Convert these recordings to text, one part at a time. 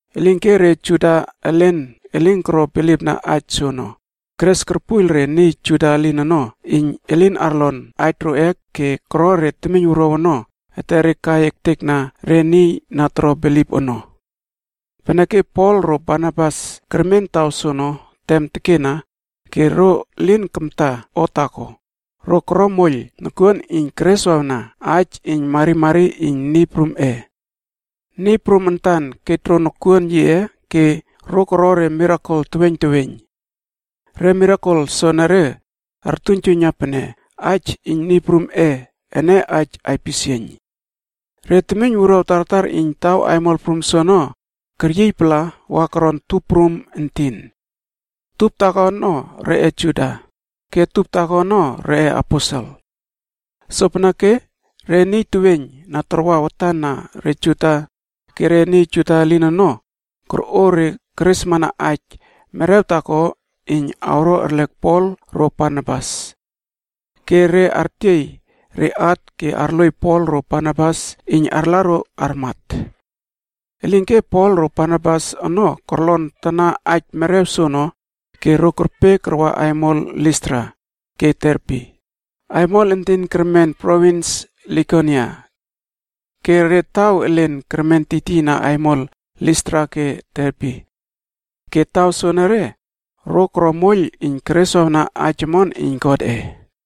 Elinke re Juda elen elin koro bilipna aij soono, keres korpuiyl re niy Juda elin ono iyn elin arlon aij roꞌe ke koro re temiynwuruaw ono etere kai ektekna re niy na toro bilip ono. Peneke Pol ro Barnabas kermen taw soono tem tekena ke ro lin kamta o taako, ro koro moiyl nokuon iyn kereswawna aij iyn marimari iyn Niy Prumꞌe. Niy Prum antan kej ro nokuon yiꞌe ke ro koro re mirakel teweiyn teweiyn. Re mirakel soenere artuiynjuiyna pene aij iyn Niy Prumꞌe ene aij aipisieiyn. Re temiyn wuruaw tartar iyn taw aimol prum soono, keryiy pala wa koron tup prum entin. Tup taako ono reꞌe Juda, ke tup taako ono reꞌeAposel. Sopeneke re niy teweiyn na tarwa watan na re Juda ke re niy Juda elin ono, korꞌo re keresmana aij merew taako iyn awro arlek Pol ro Barnabas. Ke re artiey re at ke arloiy Pol ro Barnabas iyn arla ro armat. Elinke Pol ro Barnabas ono korlon tana aij merew soono ke ro kerpe karwa aimol Listra ke Derbe, aimol entin kermen provins Likonia. Ke re taw elen kermen tiytiyna aimol Listra ke Derbe. Ke taw soonore, ro koro moiyl iyn kereswawna aij omon iyn Godꞌe.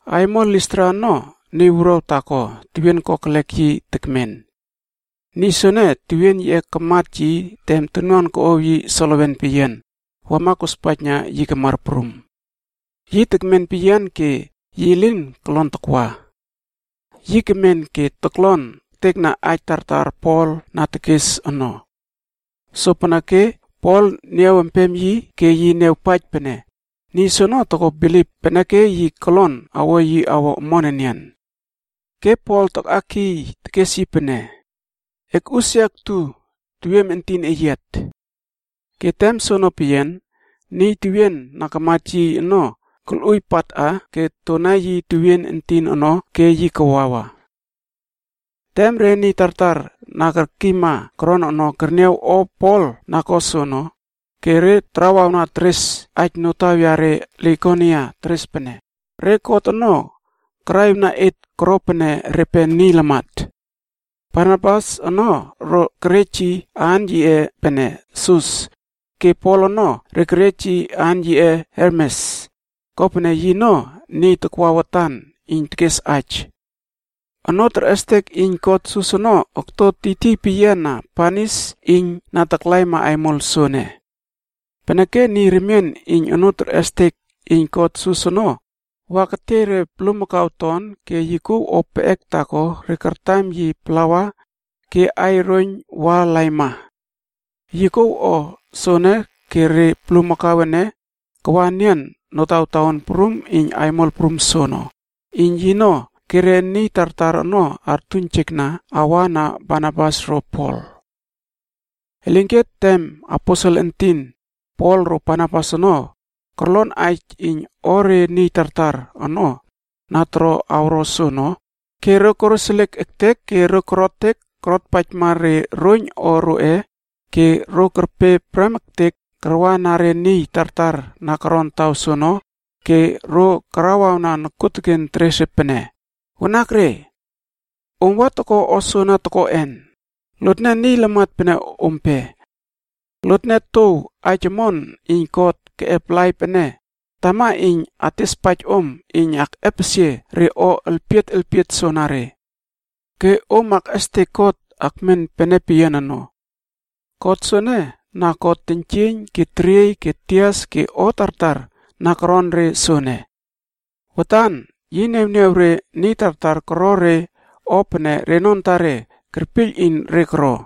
Aimol Listra ono niy wuruaw taako tewien kokelek yi tekmen. Niy soene tewien yiꞌe karmat yi tem tonuan koꞌow yi solewen peyian, wama kospaijna yi kamar prum. Yi tekmen peyian ke yi lin kolon takwa. Yi kemen ke toklon ektekna aij tartar Pol na tekes ono. Sopeneke Pol niaw empem yi ke yi niawpaij pene, niy soono toko bilip peneke yi kolon awo yi awo omon enian. Ke Pol takꞌakiy tekes yi pene, “Ekꞌusia ektu tewiem entin eyiat!” Ke tem soono peyian, niy tewien na kamat yi ono kolꞌuiy patꞌa ke tona yi tewien entin ono ke yi kawawa. Tem re niy tartar na kerkiyma koron ono, kerniaw o Pol na ko soono, ke re tarawawna teres aij notaw yare Likonia teres pene, “Re god ono karaꞌiwna et koro pene repe niy lamat!” Barnabas ono re kerej yi aan yiꞌe pene Sus ke Pol ono re kerej yi aan pene Hermes, kopene yino niy takwa watan iyn tekes aija. Onoo terꞌestek iyn god Sus ono okto tiytiy peyiana banis iyn na taklaima aimol soene. Peneke niy remien iyn onoo terꞌestek iyn god Sus ono wa ketiey re bulmakau ton ke yi kouw o peꞌek taako re kartam yi plawa ke aiy roiyn wa laima. Yi kouw o soono ke re bulmakau ene kawa enian notawtaon prum iyn aimol prum soono, iyn yino ke re niy tartar ono artuiynjekna awa na Barnabas ro Pol. Elinke tem aposel entin Pol ro Barnabas ono korlon aij iyn o re niy tartar ono na toro awro soono ke ro koroseliek ektek ke korotek korotpaijmab re roiyn o roꞌe ke ro kerpe prem ektek karwana re niy tartar na koron taw soono ke ro karawawna nokuoteken teres re pene, “Wanakre! Om wa toko o soana tokoꞌen? Lotne niy lamat pene ompe. Lotne touw aij omon iyn God keꞌep laip ene, tama iyn atespaij om iyn akꞌepesie re o elpiet elpiet soanare. Ke om akꞌestek God akmen pene peyian ono. God soene, na ko teiynjieiyn ke teriey ke tias ke o tartar na koron re soene. Watan yi niawniaw re niy tartar koro re o pene reno antare kerpiyl iyn re koro.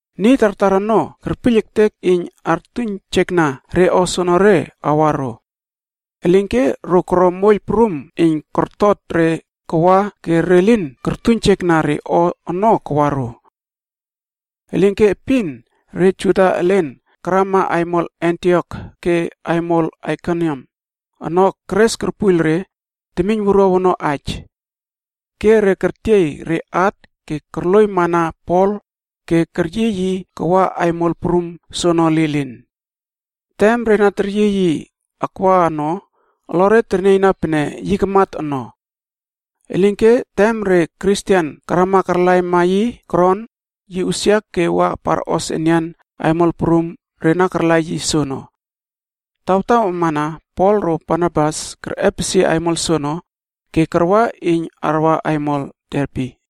Niy tartar ono kerpiyl ektek iyn artuiynjekna re o soonore awa ro. Elinke ro koro moiyl prum iyn kortot re kawa ke re lin kortuiynjekna re o ono kawa ro. Elinke epin re Juda elen karama aimol Antiok ke aimol Aikoniam ono keres korpuiyl re temiyn wuruaw ono aij. Ke re kertiey re at ke korloiymana Pol ke keryiy yi kawa aimol prum soono lilin. Tem re na teryiy yi akwa ono, olore ternieyna pene yi kamat ono. Elinke tem re Kristen karama karlaima yi koron, yi usia ke wa parꞌos enian aimol prum re na karla yi soono. Tawtaw amana Pol ro Barnabas kerꞌepesie aimol soono, ke karwa iyn arwa aimol Derbe.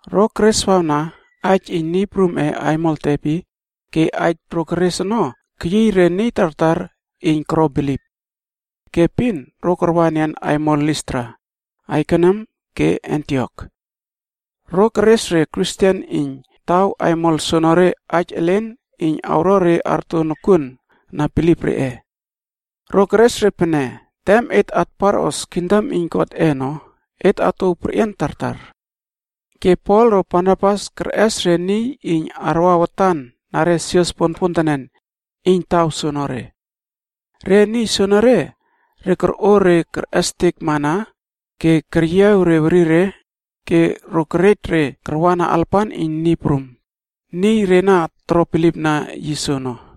Ro kereswawna aij iyn Niy prumꞌe aimol Derbe ke aij ro keres ono keyiy re niy tartar iyn koro bilip. Ke epin ro karwa enian aimol Listra, Aikoniam ke Antiokc. Ro keres empema re Kristen iyn taw aimol soonore aij elen iyn awo re arto nokuona bilip reꞌe. Ro keres re pene, “Tem et atparꞌos kingdom iyn Godꞌe ono, et atouw perꞌian tartar.” Ke Pol ro Barnabas kerꞌes re niy iyn arwa watan na re sios ponpontenen, iyn taw soonore. Re niy soonore, ro korꞌo re kerꞌestek mana ke keryiaw re werire ke ro kerej re karwana alapan iyn Niy Prum, niy re na toro bilipna yi soono.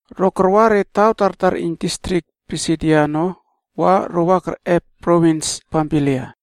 Ro karwa re taw tartar iyn distrik Pisidia ono wa ro wama kerꞌep provins Pamfilia.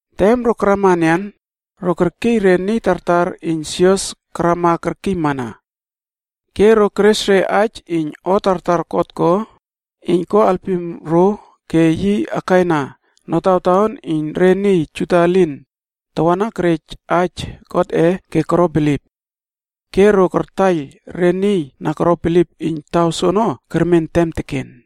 Tem ro karama enian, ro kerkiy re niy tartar iyn sios karama kerkiymana. Ke ro keres re aij iyn o tartar God ko iyn ko alpim ro ke yi akaina notawtaon iyn re niy Juda elin tawana kerej aij Godꞌe ke koro bilip. Ke ro kartaiyl re niy na koro bilip iyn taw soono kermen tem teken.